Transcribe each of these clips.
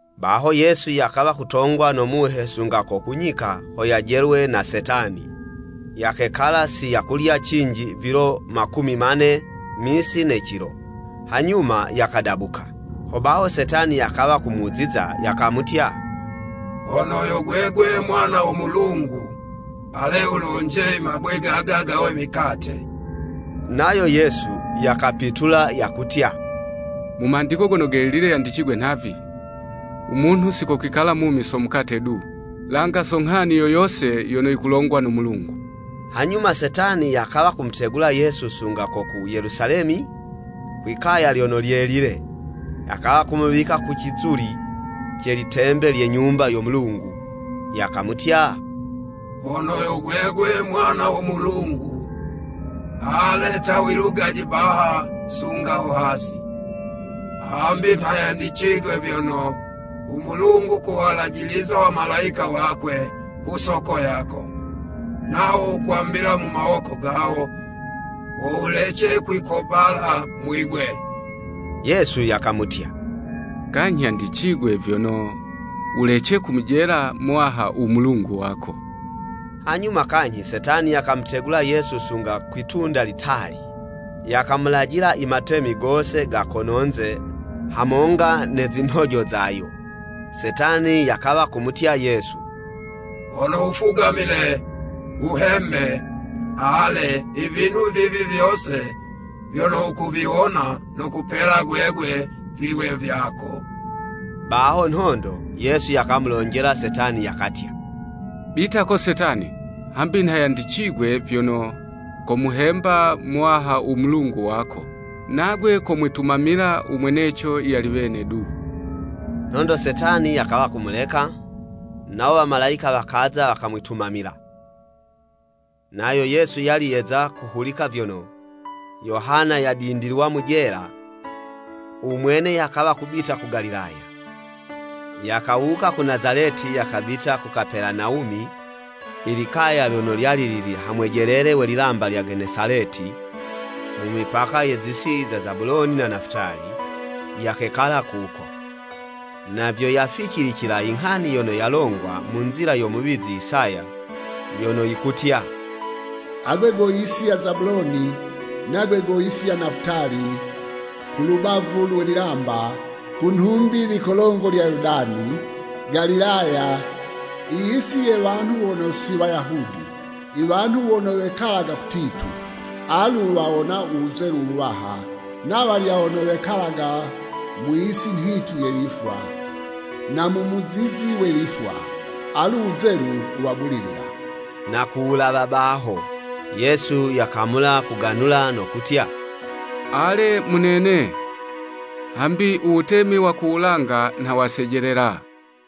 Baho Yesu yakawa kutongwa no Muhe sunga ko ku nyika ho yajelwe na Setani. Yakekala si yakulya cinji vilo makumi mane misi ne cilo, hanyuma, yakadabuka. Hobaho Setani yakawa kumuziza, yakamutya, “Hono yo gwegwe Mwana wo Mulungu, ale wulonje i mabwe gaga gawe mikate.” Nayo Yesu yakapitula yakutya, “Mu Mandiko Gono Gelile yandicigwe nhavi, ‘U munhu si kokwikala mumi so mukate du, langa so nghani yo yose yono yikulongwa no Mulungu.’” Hanyuma Setani yakawa kumutegula Yesu sunga ko ku Yelusalemi kwi'kaya lyono lyelile, yakawa kumuwika ku cizuli ce litembe lye Nyumba yo Mulungu, yakamutya, “Hono yo gwegwe Mwana wo Mulungu, ale ta wilugaje baha sunga ho hasi, hambi nha yandicigwe vyono, ‘U Mulungu kowalajiliza wamalayika wakwe ku soko yako, nawo wokwambila mu mawoko gawo, ho wulece kwikobala mwibwe.’” Yesu yakamutya, “Kanyhi yandicigwe vyono, ‘Wulece kumujela Muwaha u Mulungu wako.’” Hanyuma kanyhi Setani yakamutegula Yesu sunga kwi'tunda litali, yakamulajila i matemi gose ga kononze hamonga ne zinhojo zayo, Setani yakawa kumutya Yesu, “Hono wufugamile, wuhembe, ale, ivinhu vivi vyose vyono wukuviwona, nokupela gwegwe viwe vyako.” Baho nhondo, Yesu yakamulonjela Setani yakatya, “Bita ko Setani! Hambi nha yandikwe vyono, ‘Komuhemba Muwaha u Mulungu wako, nagwe komwitumamila u mweneco yali wene du.’” Nhondo Setani, yakawa kumuleka, nawo wamalayika wakaza wakamwitumamila. Nayo Yesu yali yeza kuhulika vyono, Yohana yadindilwa mu jela, u mwene, yakawa kubita ku Galilaya. Yakawuka ku Nazaleti yakabita ku Kapelanawumi, i likaya lyono lyali lili ha mwejelele we lilamba lya Genesaleti, mu mipaka ye zi'si za Zabuloni na Nafutali, yakekala kuko. Na vyo yaficilicila inghani yono yalongwa mu nzila yo muwizi Isaya, yono yikutya, “Agwe go yisi ya Zabuloni, nagwe go yisi ya Nafutali, kulubavu lwe lilamba, ku nhumbi likolongo lya Yoludani, Galilaya, iyisi ye wanhu wono si Wayahudi! Iwanhu wono wekalaga kutitu alu wawona u wuzelu wuwaha. Na walya wono wekalaga mu yisi nhitu ye lifwa, na mu muzizi we lifwa, alu wuzelu wuwabulilila!” Na ku wulawa baho, Yesu yakamula kuganula no kutya, “Ale, munene, hambi u wutemi wa ku wulanga nha wasejelela!”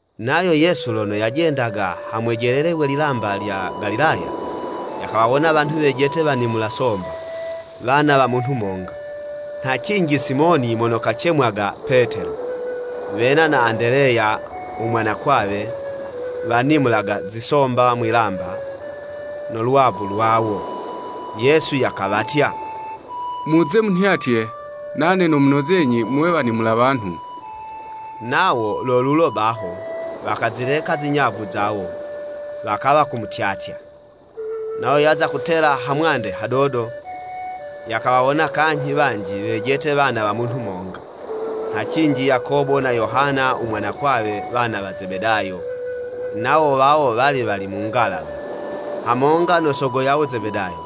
Nayo Yesu lono yajendaga ha mwejelele we lilamba lya Galilaya, yakawawona wanhu wejete wanimula somba, wana wa munhu monga, nha cinji Simoni (mono kacemwaga Petelo) wena na Andeleya u mwanakwawe, wanimulaga zisomba mwi'lamba no lwavu lwawo. Yesu yakawatya, “Muze munhyatye, nane nomunozenyi muwe wanimula wanhu.” Nawo lo lulo baho, wakazileka zinyavu zawo, wakawa kumutyatya. Nayo yaza kutela hamwande hadodo, yakawawona kanyhi wanji wejete wana wa munhu monga, nha cinji Yakobo na Yohana u mwanakwawe, wana wa Zebedayo. Nawo wawo wali wali mu ngalawa, hamonga no sogo yawo Zebedayo,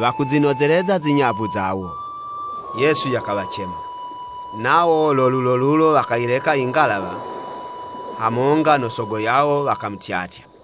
wakuzinozeleza zinyavu zawo. Yesu yakawacema, nawo lo lulolulo wakayileka ingalawa, hamonga no sogo yawo, wakamutyatya.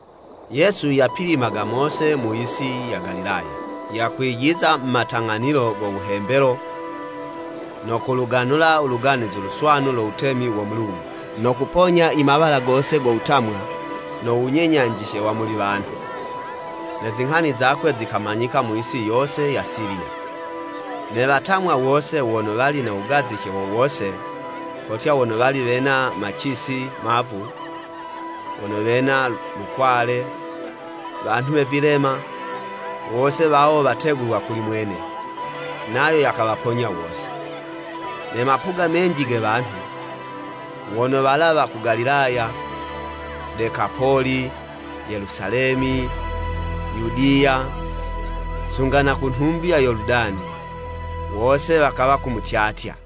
Yesu yapilimaga mose mu yisi ya Galilaya, yakwijiza mu matang'anilo go wuhembelo, no kuluganula u Luganuzi Luswanu lo Wutemi wo Mulungu. No kuponya i mawala gose go wutamwa no wunyenyanjice wa muli wanhu. Ne zinghani zakwe zikamanyika mu yisi yose ya Siliya. Ne watamwa wose wono wali na wugazice wo wose, kotya, wono wali wena macisi mavu, wono wena lukwale, wanhu we vilema, wose wawo wategulwa kuli mwene, nayo yakawaponya wose. Ne mapuga menji ge wanhu, wono walawa ku Galilaya, Dekapoli, Yelusalemi, Yudiya, sunga na ku nhumbi ya Yoludani, wose wakawa kumutyatya.